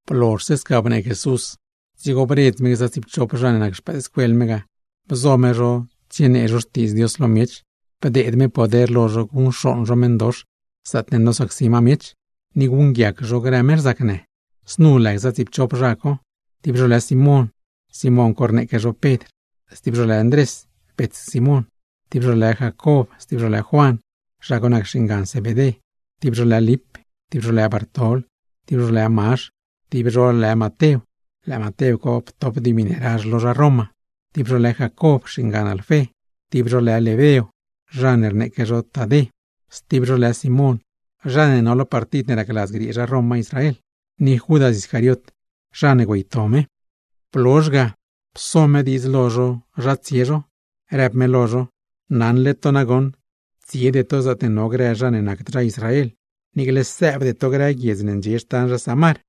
Blozhse sca bnee Jesús, dzigo bredz me gza tsiipchop zha ne nac xpëëdscuel me ga, bzo me zho tsienee zho Xtiidz Dios lo miech, bdeed me poder lo zho guṉcxooṉ zho meṉdox zaatne nosacsi ma miech, ni guṉguiac zho grë meṉ rzacnë. Znu lë gza tsiipchop zha co: Simón (zha ne rneeque zho Pedr), Ndrés (bets Simón), Jacob ni Juan (zha co nac xingan Zebedé), Lip, Bartol, Mazh, Matew (zha ne ptop dimi ne razh lo zha Roma), Jacob (xingan Alfé), Lebeo (zha ne rneeque zho Tadé), Simón (zha ne no lo partid ne racladz griee zha Roma Israel), ni Judas Iscariot (zha ne güeyto Jesús). Blozhse ga, pso me diidz lo zho zha tsie zho, rëb me lo zho: ―Naṉle to nagoṉ, tsiede to zaatne no grë zha ne nacd zha Israel, niicle sëëbde to grë guiedz ne ndxie xtan zha Samar.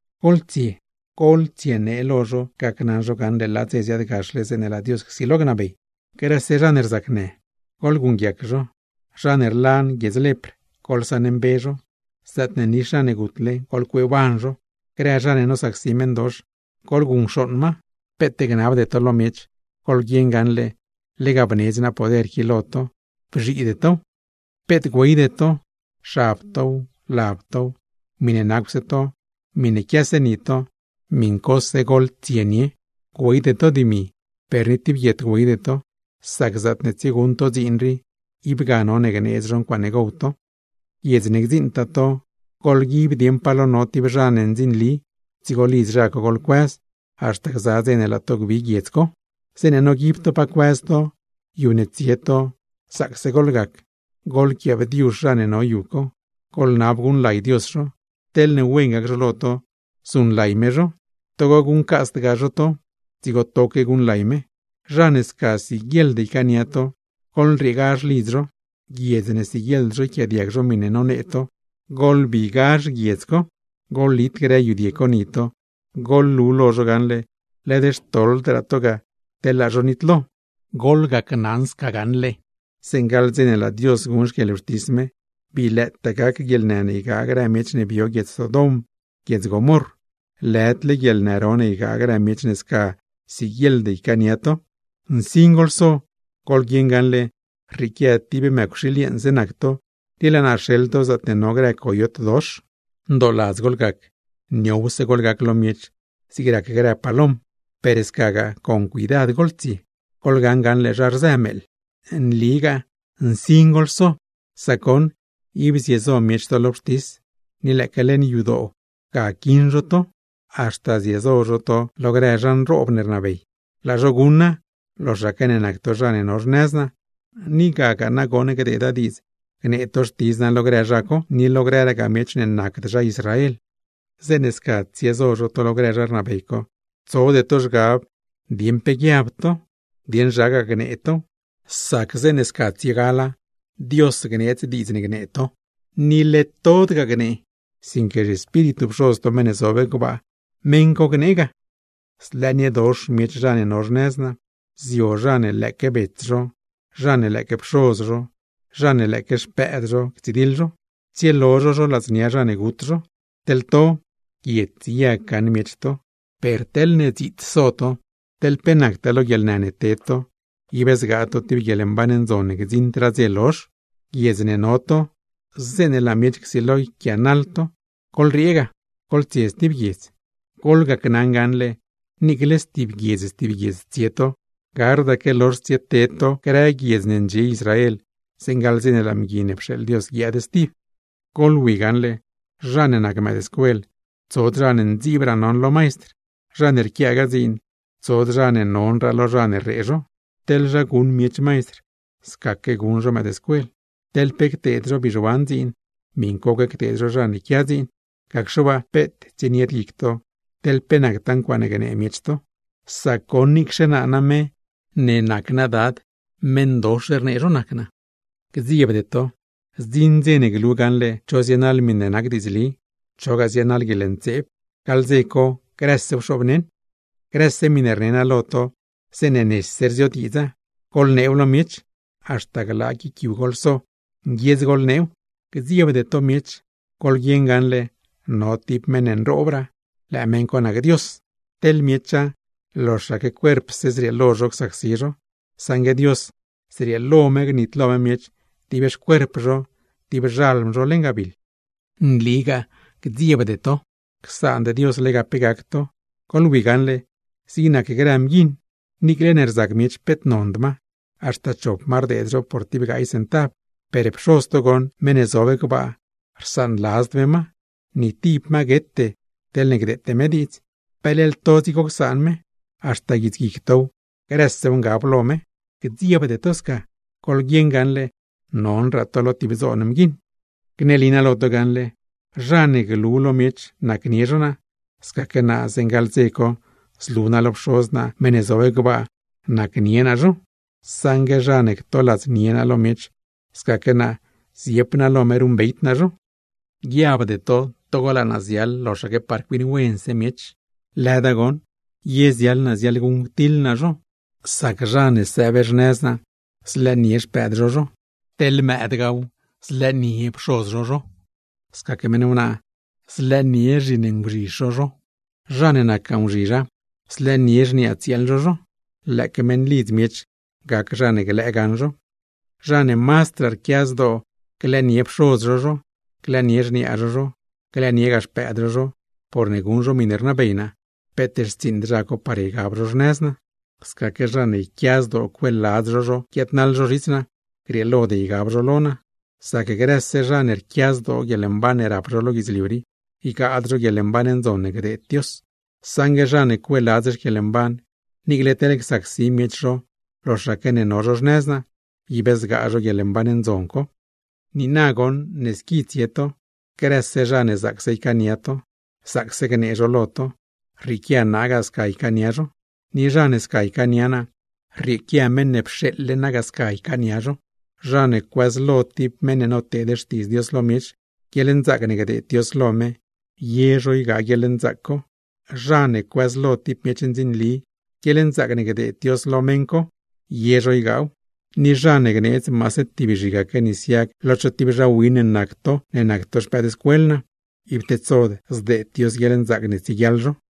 ’Goḻtsie, goḻtsienee lo zho gacnaṉ zho gaṉle laa dze ziaadgaxle zeeṉe laa Dios csilo gnabey. ’Grëse zha ne rzacnë, goḻguṉguiac zho; zha ne rlan guiedz lepr, goḻsaṉmbe zho; zaatne nix zha ne gutle, goḻcueeban zho; grë zha ne nosacsi meṉdox, goḻguṉcxooṉ ma. Peet gnabde to lo miech, goḻguieṉ gaṉle lega bnedz naa poder qui lo to, bzhiide tow. ’Peet güeyde to, xab tow, lab tow, miṉe nacwse to, miṉe quiase ni to, miṉcose goḻtsienie. Güeyde to dimi, per ni tib guiet güeyde to; sac zaatne tsieguṉ to dziin rii, ib ga none gneedz zho ncuaaṉe gow to. ’Guiedz ne gdziṉtaa to, goḻguib dieṉ pa lo no tib zha ne ndzinli, dzigo lidz zha co goḻtsiebëz, haxta gza dze ne laa to gbi guiedz co. Zeeṉe noguib to pa cuëz to, yu ne tsie to, zaacse goḻgac, goḻquiaabdiuzh zha ne no yu co, goḻnab guṉlay Dios zho. Teḻne wen gac zho lo to, zuṉlay me zho, togo guṉcasdgaa zho to, dzigo toque guṉlay me. Zha ne sca siguieḻd ycaania to, goḻrieegazh lidz zho; guiedz ne siguieḻd zho yquiaadiag zho miṉe nonee to, goḻbigazh guiedz co; goḻlit grë yudie co ni to, goḻlu lo zho gaṉle led xtoḻdraa to ga teḻ laa zho nitlo. Gneli naa lo to gaṉle zeeṉe gaḻ dze ne laa Dios guṉ xquieḻwxtis me, bii lëëtaa gac guieḻnë ne ygaa grë miech ne bio guiedz Sodom, guiedz Gomorr, lëdle guieḻnë ro ne ygaa grë miech ne sca siguieḻd ycaania to. ’Nsin goḻso, goḻguieṉ gaṉle rrieequia tib mëcwxiil yeeṉse nac to, ni laa naa rxeḻ to zaatne no grë coyot dox. Ndooladz goḻgac, niowse goḻgac lo miech zig rac grë palom, per scagaa con cuidad goḻtsie, goḻgaṉ gaṉle zha rzë meeḻ. Nligaa nsin goḻso, sac goṉ ib ziezo miech to lo wxtis, ni lëëque leṉ yadoo ga quiṉ zho to, haxta ziezo zho to lo grëraa zha nroob ne rnabey. Laa zho guṉa, loxaque ne nac to zha ne no xnëz naa, ni gagaa nagoṉ gdeeda diidz gnee to xtidz naa lo grë zha co, ni lo grëragaa miech ne nacd zha Israel. ’Zeeṉe sca tsiezo zho to lo grë zha rnabey co, tsode to zhgab dieṉ pe gnee to, dieṉ zhagaa gnee tow; sac zeeṉe sca tsiegala, Dios gneedz diidz ne gnee to. Led tod gnee, sinque, ¡zhiEspíritu Pxoz to meṉ ne zob gbaa, meṉ co gnee ga! ’Zlëëniedox miech zha ne no xnëz naa. Zio zha ne lëëque bets zho, zha ne lëëque pxoz zho, zha ne lëëque xpëëd zho ctsidiḻ zho, tsielo zho zho ladznia zha ne gut zho. Teḻ to, guiets yag gaṉ miech to, per teḻne dziits so to teḻ pe nactaa lo guieḻnë ne ted to, ib zgaa to tib guieḻmban ndzon ne gdziṉdraa dze lozh. Guiedz ne no to, zeeṉe laa miech csilo yquiaanaḻ to, goḻriee ga, goḻtsie stib guiedz. Gneli naa lo to gaṉle, niicle stib guiedz stib guiedz tsie to, gardaque lozh tsieted to grë guiedz ne ndxie Israel zeeṉe gaḻ dze ne laa Mgui ne pxeeḻ Dios guiaad stib. ’Goḻwi gaṉle zha ne nac mëëdscuel, tsod zha ne ndziibraa non lo maistr, zha ne rquiagaa dziin, tsod zha ne nonraa lo zha ne rree zho. Teḻ zha guṉ miech maistr, scaque guṉ zho mëëdscuel; teḻ pe cteed zho bizhuan dziin, miṉcoque cteed zho zha ne quia dziin. Gacxe waa peet tsienied guic to, teḻ pe nactaa ncuaaṉe gnee miech to, sac goṉ niicxe naa name ne nac naa Dad, meṉdox rnee zho nac naa. ’Gdziebde to, zdziṉ dze ne glu gaṉle cho zienaḻ miṉe nac diidzli, chogaa zienaḻ guieḻntseeb, gaḻ dze co grësew xoobneṉ. ’Grëse miṉe rne naa lo to zeeṉe nese rziodiidza, goḻneew lo miech, haxta glaa guic yu goḻso, nguiedz goḻneew. Gdziebde to miech, goḻguieṉ gaṉle no tib meṉ nroobraa, lëë meṉ co nac Dios. Teḻ miecha, loxaque cuerpse zrieelo zho csacsi zho, saṉgue Dios, zrieelo me gnitlo me miech dib xcuerp zho, dib xalm zho leṉ gabiḻ. ’Nligaa gdziebde to, csaand Dios lega pe gac to. Goḻwi gaṉle, zig nac grë mguiṉ niicle ne rzac miech peet nond ma, haxta chop ma rdeed zho por tib gaay centav; per Pxoz to goṉ meṉ ne zob gbaa rsaanladzd me ma, ni tib ma guete teḻne gdeete me diidz. Peleḻ to dzigo csaan me, haxta guits guic tow, grësew ngaba lo me. Gdziebde to sca, goḻguieṉ gaṉle nonraa to lo tib dzoon mguiṉ. ’Gneli naa lo to gaṉle, zha ne glu lo miech nacnie zho naa, scaque naa zeeṉ gaḻ dze co zlu naa lo Pxoz naa meṉ ne zob gbaa, nacnie naa zho. Saṉgue zha ne ctoladznie naa lo miech, scaque naa ziep naa lo me ruṉbeyd naa zho. ’¡Guiabde to togo laa naa ziaḻ loxaque par cuiṉ wense miech! Lëda goṉ, ye ziaḻ naa ziaḻguṉctiḻ naa zho. Sac zha ne sëëb xnëz naa, zlëënie xpëëd zho zho, teḻ mëëdgaaw, zlëënie pxoz zho zho; scaque meṉ wnaaw, zlëënie xinzhizh zho zho, zha ne nacgaa nguzhizha, zlëënie xniaa tsieel zho zho. ¡Lëëque meṉlidz miech gac zha ne glëë gaṉ zho! ’Zha ne mazdraa rquia zdoo glëënie pxoz zho zho, glëënie xniaa zho zho, glëëniegaa xpëëd zho zho, porne guṉ zho miṉe rnabey naa, peet xtsiiṉd zha co par ygab zho xnëz naa. Scaque zha ne yquia zdoo cueeladz zho zho guiaadnaḻ zho zhits naa, grieelod ygab zho lo naa. Sac grëse zha ne rquia zdoo guieḻmban ne rap zho lo guidzliu rii, ygaad zho guieḻmban ndzon ne gneedz Dios; saṉgue zha ne cueeladz xquieḻmban, niicle teḻ csacsi miech zho loxaque ne no zho xnëz naa, ib zgaa zho guieḻmban ndzon co. ’Niina goṉ ne squi tsie to, grëse zha ne zaacse ycaania to, zaacse gnee zho lo to, rrieequia naa ga sca ycaania zho; ni zha ne sca ycaania naa, rrieequia meṉ ne pxeeḻle naa ga sca ycaania zho. Zha ne cuëzlo tib meṉ ne noteed xtiidz Dios lo miech, guieḻnzaac ne gdeed Dios lo meṉ co, ye zho ygaa guieḻnzaac co. Zha ne cuëzlo tib miech ndzinli, guieḻnzaac ne gdeed Dios lo zha co, ye zho ygaaw. Ni zha ne gneedz maase tib zhigaque nis yag lo cho tib zha win ne nac to ne nac to xpëëdscuel naa, ib tedsod zdeed Dios guieḻnzaac ne tsieguiaḻ zho.